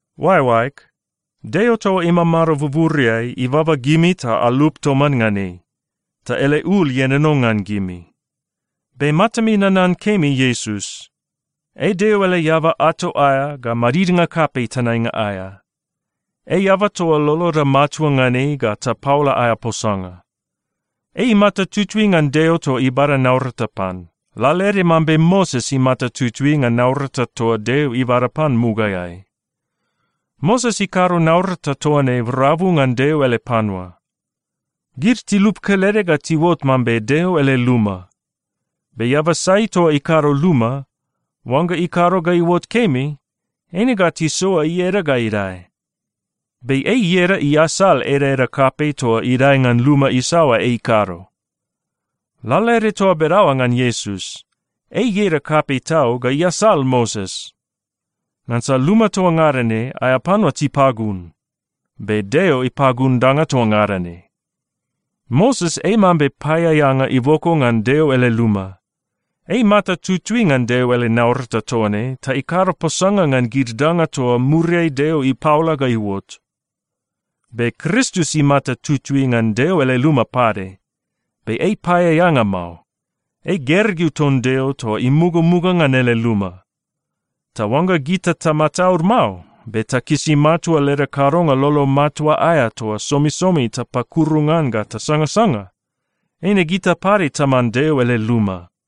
Oaeoaeg, Deo toa imamado buburiai ibaba gimi ta alup toman ngan ei, ta ele ul ienono ngan gimi. Be matami nanan kemi Iesus. Ei Deo ele eaba ato aea ga madidnga kapei tenainga aea. Ei eaba toa loloda matua ngan ei ga tapaola aea posanga. Ei imata tutui ngan Deo toa ibada naurata pan, lalaede mambe Moses imata tutui ngan naurata toa Deo ibada pan mugaeai. Moses ikado naurata toa ne rabu ngan Deo ele panua. Gid tilup kelede ga tiuot mambe Deo ele luma. Be eaba sai toa ikado luma, oangga ikado ga iuot kemi, eine ga tisoa ieda ga idae. Be ei ieda iasal edaeda kapei toa idae ngan luma isaoa ei ikado. Lalaede toa bedaoa ngan Iesus, ei ieda kapei tau ga iasal Moses. Ngansa luma toa ngada ne, aea panua tipagun. Be Deo ipagun danga toa ngada ne. Moses ei mambe paeaeanga iboko ngan Deo ele luma. Ei imata tutui ngan ele naurata toa ne ta ikado posanga ngan gid danga toa muriai Deo ipaola ga iuot. Be Kristus imata tutui ngan Deo ele luma pade. Be ei paeaeanga mao. Ei gergeu ton Deo toa imugamuga ngan ele luma. Ta oangga gita tamataud mao, be takisi matua leda kadonga lolo matua aea toa somisomi tapakuru ngan ga tasangasanga, eine gita pade taman Deo ele luma.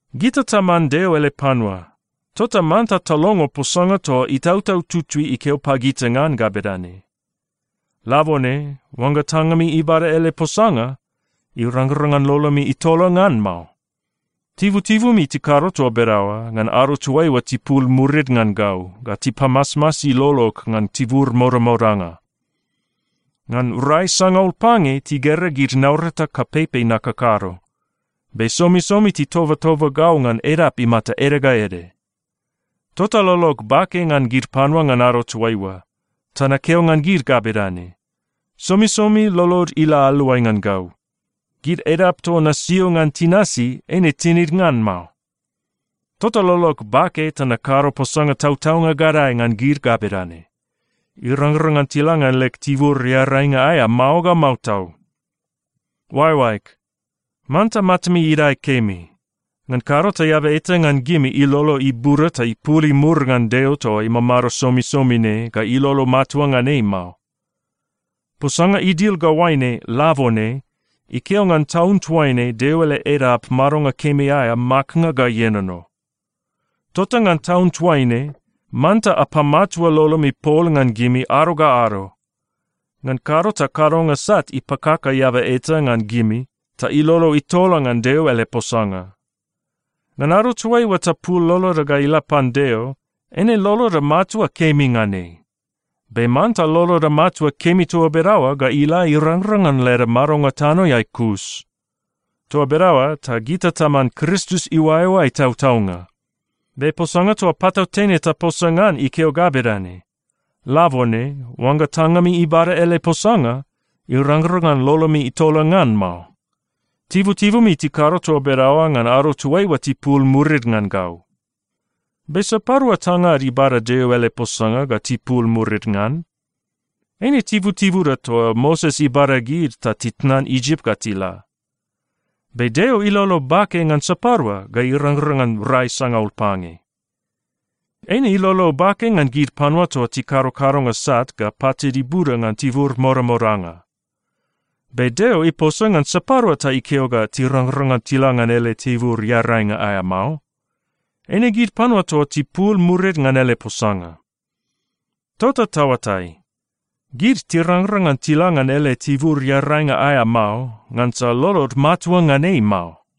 Gita taman Deo ele panua, tota manta talongo posanga toa Itautau Tutui ikeo pagita ngan ga bedane, “Labone, oangga tangami ibada ele posanga, irangrang ngan lolomi itola ngan mao. Tibutibumi tikado toa bedaoa ngan ado toaiua tipul murid ngan gau ga tipamasmasi lolog ngan tibur modamodanga. Ngan rai sangaul pange, tigera gid naurata kapeipei nakakado, be somisomi titobatoba gau ngan edap imata ede ga ede. Tota lolog bake ngan gid panua ngan ado toaiua. Ta nakeo ngan gid ga bedane, ‘Somisomi lolod ila aluai ngan gau. Gid edap toa nasio ngan tinasi, eine tinid ngan mao.’ Tota lolog bake ta nakado posanga tautaunga gadae ngan gid ga bedane, ‘Irangrang ngan tila ngan leg tibur earainga aea mao ga mao tau.’” Oaeoaeg, manta matami idae kemi. Ngan kado ta eaba eta ngan gimi ilolo ibuda ta ipul imur ngan Deo toa imamado somisomi ne ga ilolo matua ngan ei mao. Posanga idil ga oaine “Labone” ikeo ngan taun toaine Deo ele edap madonga kemi aea maknga ga ienono. Tota ngan taun toaine, manta apamatua lolomi pol ngan gimi ado ga ado. Ngan kado ta kadonga sat ipakaka eaba eta ngan gimi, ta ilolo itola ngan Deo ele posanga. Ngan ado toaiua tapul loloda ga ila pan Deo, eine loloda matua kemi ngan ei. Be manta loloda matua kemi toa bedaoa ga ila irangrang ngan leda madonga tanoeai kus. Toa bedaoa ta gita taman Kristus iuaeoae tautaunga. Be posanga toa patautene taposa ngan ikeo ga bedane, “Labone, oangga tangami ibada ele posanga, irangrang ngan lolomi itola ngan mao. Tibutibumi tikado toa bedaoa ngan ado toaiua tipul murid ngan gau.” Be sapadua tangad ibada Deo ele posanga ga tipul murid ngan? Eine tibutibuda toa Moses ibada gid ta titnan Isip ga tila. Be Deo ilolo bake ngan sapadua ga irangrang ngan rai sangaul pange? Eine ilolo bake ngan gid panua toa tikado kadonga sat ga patid ibuda ngan tibur modamodanga. Be Deo iposa ngan sapadua ta ikeo ga tirangrang ngan tila ngan ele tibur earainga aea mao? Eine gid panua toa tipul murid ngan ele posanga. Tota taoatai, gid tirangrang ngan tila ngan ele tibur earainga aea mao, ngansa lolod matua ngan ei mao.